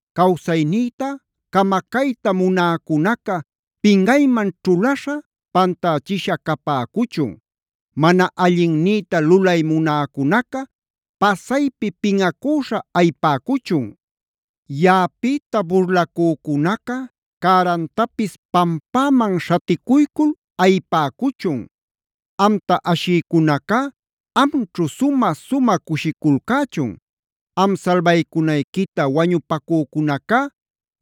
Cawsaynïta camacayta munäcunaca pinꞌayman ćhulaśha, pantächisha capäcuchun. Mana allinnïta lulay munäcunaca pasaypi pinꞌacüśha ayipäcuchun. Yaꞌapïta burlacücunaca cärantapis pampäman śhaticuycul ayipäcuchun. Amta ashïcunacá amćhu sumä-sumä cushiculcächun. Am salbaycunayquita wañupacücunacá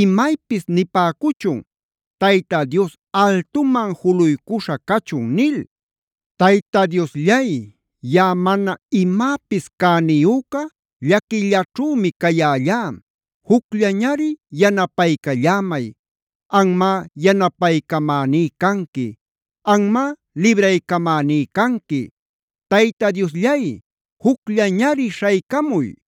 imaypis nipäcuchun: “Tayta Dios altuman juluycuśha cachun” nil. Tayta Diosllay, yaꞌa mana imäpis cäniyüca llaquillaćhümi cayällá. Jucllañari yanapaycallämay. Anmá yanapaycamäní canqui; anmá libraycamäní canqui. ¡Tayta Diosllay, jucllañari śhaycamuy!